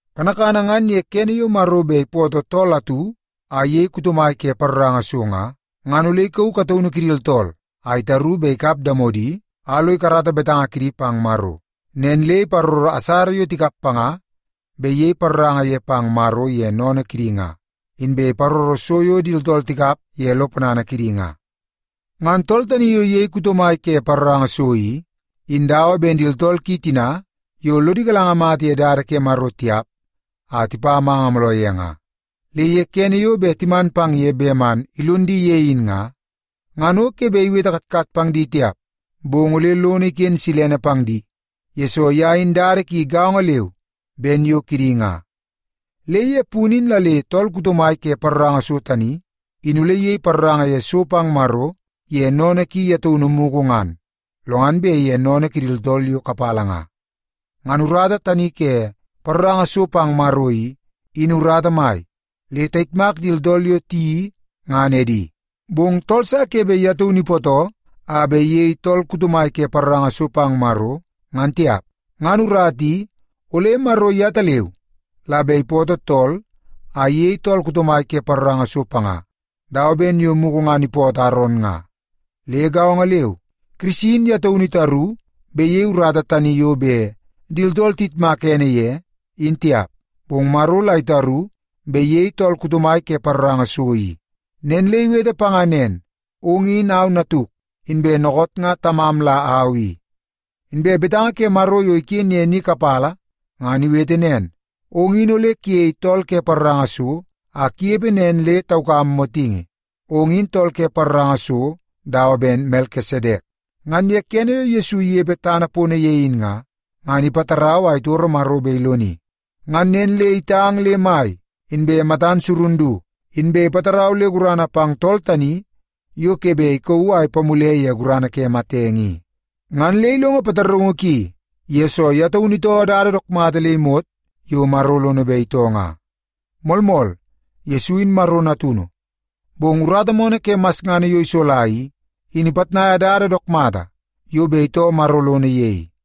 Kanakana ngan ye kene yo Maro bet ipootoo tool atu a iyei kuto mai ke paroranga so nga, ngan ole ikauu kataunu kidi tooltool a itaru bet ikap damodi a lo ikarata betanga kidi pang Maro. Nen le iparoro asara yo tikap panga bet iyei paroranga ye pang Maro ye sennene kidi nga, inbe iparoro so yo di tooltool tikap ye lo ponana kidi nga. Ngan tool tani yo iyei kuto mai ke paroranga so i, in dawa ben di tooltool ki tina yo lodi galanga mata ye dada ke Maro tiap a tipa manga mooloo ye nga. Le ye kene yo bet timan pang ye man ilon di ye in nga, ngan o ke bet iwete katkat pang di tiap, bong ole lono iken silene pang di, yesoo ye in dada ki gaongo leu ben yo kidi nga. Le ye punu in la le tool kuto mai ke paroranga so tani, in ole iyei paroranga ye so pang Maro ye sennene ki ye taunu mugu ngan, lo ngan bet ye sennene kidi tooltool yo kapala nga. Ngan urata tani ke paroranga so pang Maro i, in urata mai, le tayitmak di tooltool yo tiyeii ngan edi. Bong tool sa ke bet ye taunu ipootoo a bet iyei tool kuto mai ke paroranga so pang Maro, ngan tiap. Ngan urata i, ole Maro yetaleu la bet ipootoo tool a iyei tool kuto mai ke paroranga so panga, dawa ben yo mugu ngan ipootoo Aron nga. Le gaongo leu, Kirisi in ye taunu itaru bet iyei urata tani yo bet di tooltool iyitmak ene ye, in tiap. Bong Maro la itaru bet iyei tool kuto mai ke paroranga so i. Nen le iwete panga nen, “Ong in au Natuk, inbe dookoot nga Tamam la au i.” Inbe betanga ke Maro yo iken ye ni kapala ngan iwete nen, “Ong in ole kuyei tool ke paroranga so a kunepe nen le taukam motingi. Ong in tool ke paroranga so dawa ben Melkisedek.” Ngan ye kene yo Yesu inepe tana pono ye in nga, ngan ipatarau a itoro Maro bet iloni. Ngan nen le itang le mai inbe matan surun du, inbe ipatarau le gurana pang tool tani yo ke bet ikauu a ipamule ye gurana ke matenge i. Ngan le ilongo pataraungu ki, yesoo ye taunu itoo dada dook mata le imot yo Maro lono bet itoo nga. Moolmool, Yesu in Maro Natunu, bong urata moonoo ke masngana yo isola i, in ipitnaia dada dook mata yo bet itoo Maro lono ye i.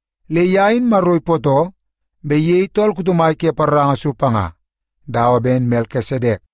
Le ye in Maro ipootoo bet iyei tool kuto mai ke paroranga so panga, dawa ben Melkisedek.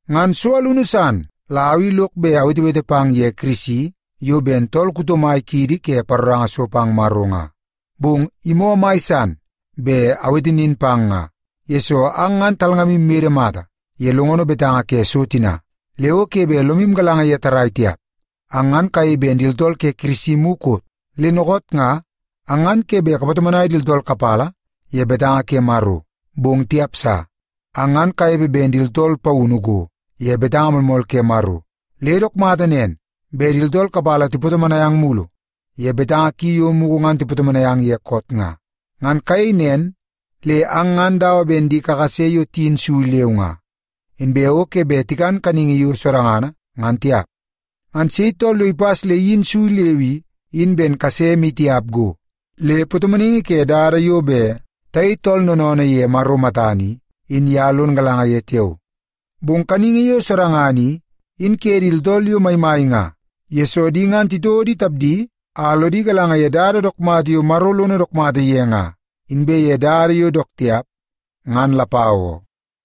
Ngan so alunu san la au i lok bet awetewete pang ye Kirisi yo ben tool kuto mai kiidi ke paroranga so pang Maro nga. Bong imoo mai san bet awete nin pang nga, yesoo ang ngan talngamu mede mata ye longono betanga ke so tina, le o ke bet lomu galanga ye tarrai tiap. Ang ngan kayei ben di tooltool ke Kirisi mukot, le dookoot nga ang ngan ke bet kapatomonai di tooltool kapala ye betanga ke Maro. Bong tiap sa! Ang ngan kanepe ben di tooltool paunu go ye betanga moolmool ke Maro, le dook mata nen bet di tooltool kapala tipatomonai ang mulu ye betanga ki yo mugu ngan tipatomonai ang ye koot nga. Ngan kayei nen le ang ngan dawa ben di kakase yo tiyin sui leu nga, inbe o ke bet tikan kaningi yo sodangana ngan tiap. Ngan sei tool yo ipas le iyin sui leu i, in ben kase maitiap go. Le patomonaingi ke dada yo bet tayei tooltool noonoonoo ye Maro matana i, in ye lon galanga ye tiao. Bong kaningi yo sodangana i, in ke di tooltool yo maimai nga. Yesoo, di ngan titouo di tapdi a lodi galanga ye dada dook mata yo Maro lono dook mata ye nga, inbe ye dada yo dook tiap ngan lapau oo.